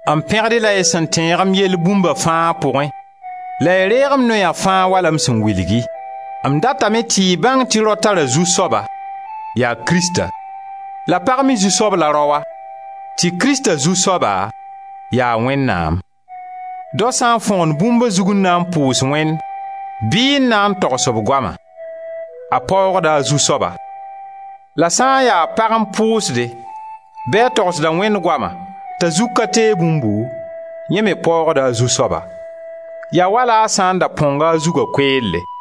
M pẽgd-y la y sẽn tẽeg m yell bũmba fãa pʋgẽ la y reeg m noya fãa wala m sẽn wilg-y. M datame tɩ y bãng tɩ rao tara zu-soaba, yaa Krista; la pag me zu-soab la raoa, tɩ Krista Zu-soaba ya Wẽnnaam. Dao sã n fõgen bũmb a zug n na n pʋʋs Wẽnd bɩ n na n togs b goama, a paoogda a zu-soaba. La sã n ya pag n pʋʋsde bɩ a togsda Wẽnd goama t'a zug ka teeg bũmbu, yẽ me paoogda a zu-soaba. Yaa wala a sã n da põnga a zuga koeelle.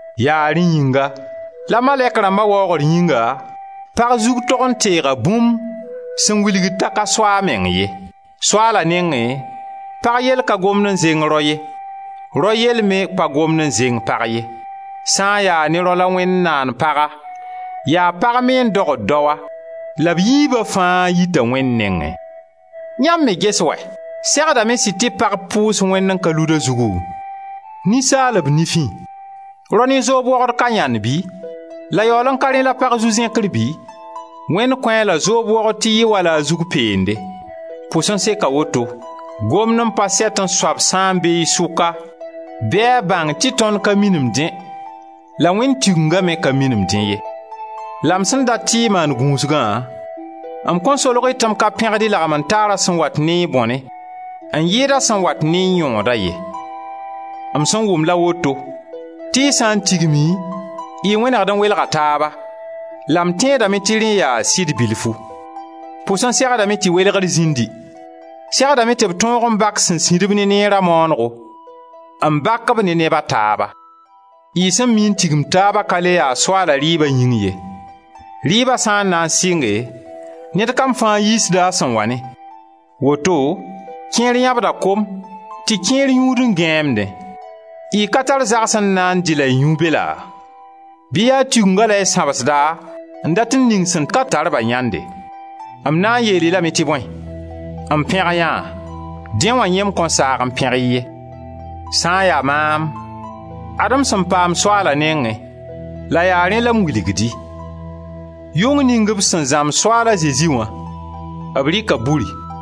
Yaa rẽ yĩnga, la malɛk rãmba waoogr yĩnga, pag zug tog n teeg bũmb sẽn wilgd t'a ka so a meng ye. Soaala nengẽ pag yell ka gomd n zẽng rao ye, rao yell me pa gomd n zẽng pag ye. Sã n ya ne rao la Wẽnd naan paga, yaa pag me n dogd daoa la b yiiba fãa yita Wẽnd nengẽ. Yãmb me ges wɛ! Segdame sɩd tɩ pag pʋʋs Wẽnd n ka lud a zugu? Ninsaalb nifẽ, rao ne zoob wogd ka yãnd bɩ? La yaool n ka rẽ la pag zu-zẽkr bɩ? Wẽnd kõ-a la zoob wogd tɩ yɩ wala a zug peende. Pʋs n seka woto, gomd n pa sɛtẽ soab sã n be y sʋka bɩ a bãng tɩ tõnd ka minim dẽ, la Wẽnd Tigenga me ka minim dẽ ye. La m sẽn dat tɩ y maan gũusgã, m kõn solg-y tɩ m ka pẽgd y lagmen-taarã sẽn wat ne y bõne n yɩɩd a sẽn wat ne y yõodã ye. M sẽn wʋm la woto, tɩ y sã n tigime y wẽnegd n welga taaba, la m tẽedame tɩ rẽ yaa sɩd bilfu. Pʋs n segdame tɩ welegr zĩndi, segdame tɩ b tõog n bak sẽn sĩdb ne neera maanego, n bak-b ne neb a taaba. Y sẽn mii n tigim taabã ka le ya Soaala rɩɩba yĩng ye. Rɩɩba sã n na n sɩnge, ned kam fãa yiisda a sẽn wa ne; woto kẽer yãbda kom, tɩ kẽer yũud n gãeemdẽ. Y ka tar zagse n na n dɩ la y yũ be laa? Bɩ yaa Tigengã la y sãbsda n dat n ning sẽn ka tar-ba yãnde? M na n yeel-y lame tɩ bõe? M pẽg yã? Dẽ wã yẽ m kõn saag n pẽg-y ye. Sã n ya maam, ad-m sẽn paam Soaala nengẽ la yaa rẽ la m wilgd-y: yʋng ning b sẽn zãmb Soaal a Zezi wã, b rɩka buri,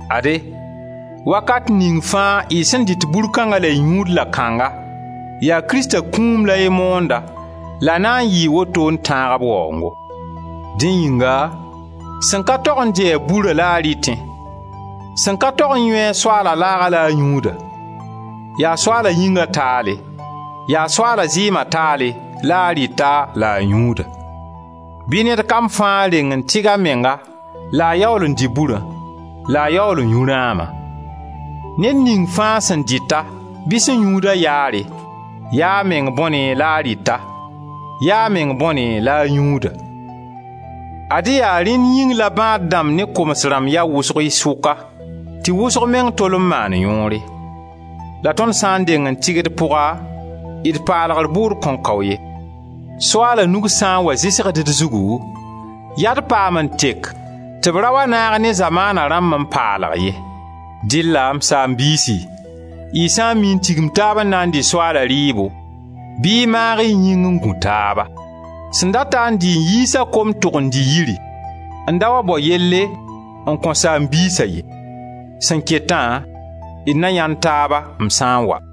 Ade, wakat ning fãa y sẽn dɩt bur kãngã la y yũud la-kãnga, yaa Krista kũum la y moonda la na n yɩɩ woto n tãag b waoongo. Dẽ yĩnga, sẽn ka tog n dɩ-ɛ burã la a rɩtẽ, sẽn ka tog n yũ Soaala laaga la a yũud-a, yaa Soaala yĩnga taale, yaa Soaala zɩɩma taale la a rɩta, la a yũuda. Bɩ ned kam fãa deng n tɩg a menga la a yaool n dɩ burã, la a yaool n yũ rãama. Ned ning fãa sẽn dɩt-a bɩ sẽn yũud-a yaare, ya a meng bõne la a rɩta, ya a meng bõne la a yũuda. Ad-y yaa rẽn yĩng la bãad-dãmb ne koms rãmb ya wʋsg y sʋka, tɩ wʋsg meng tol n maand yõore. La tõnd sã n deng n tɩg d pʋga, d paalgr bʋʋd kõn kao ye. Soaala nug sã n wa zɩsgd d zugu yaa d paam n tek tɩ b ra wa naag ne zamaana rãmb n paalg ye. Dɩlla, m saam-biisi, y sã n mii n tigim taaba n na n dɩ Soaala rɩɩbo bɩ y maag y yĩng n gũ taaba; sẽn data n dɩ n yiis a kom, tʋg n dɩ yiri n da wa bao yelle n kõ saam-biisa ye. Sẽn ketã, d na yãend taaba m sã n wa.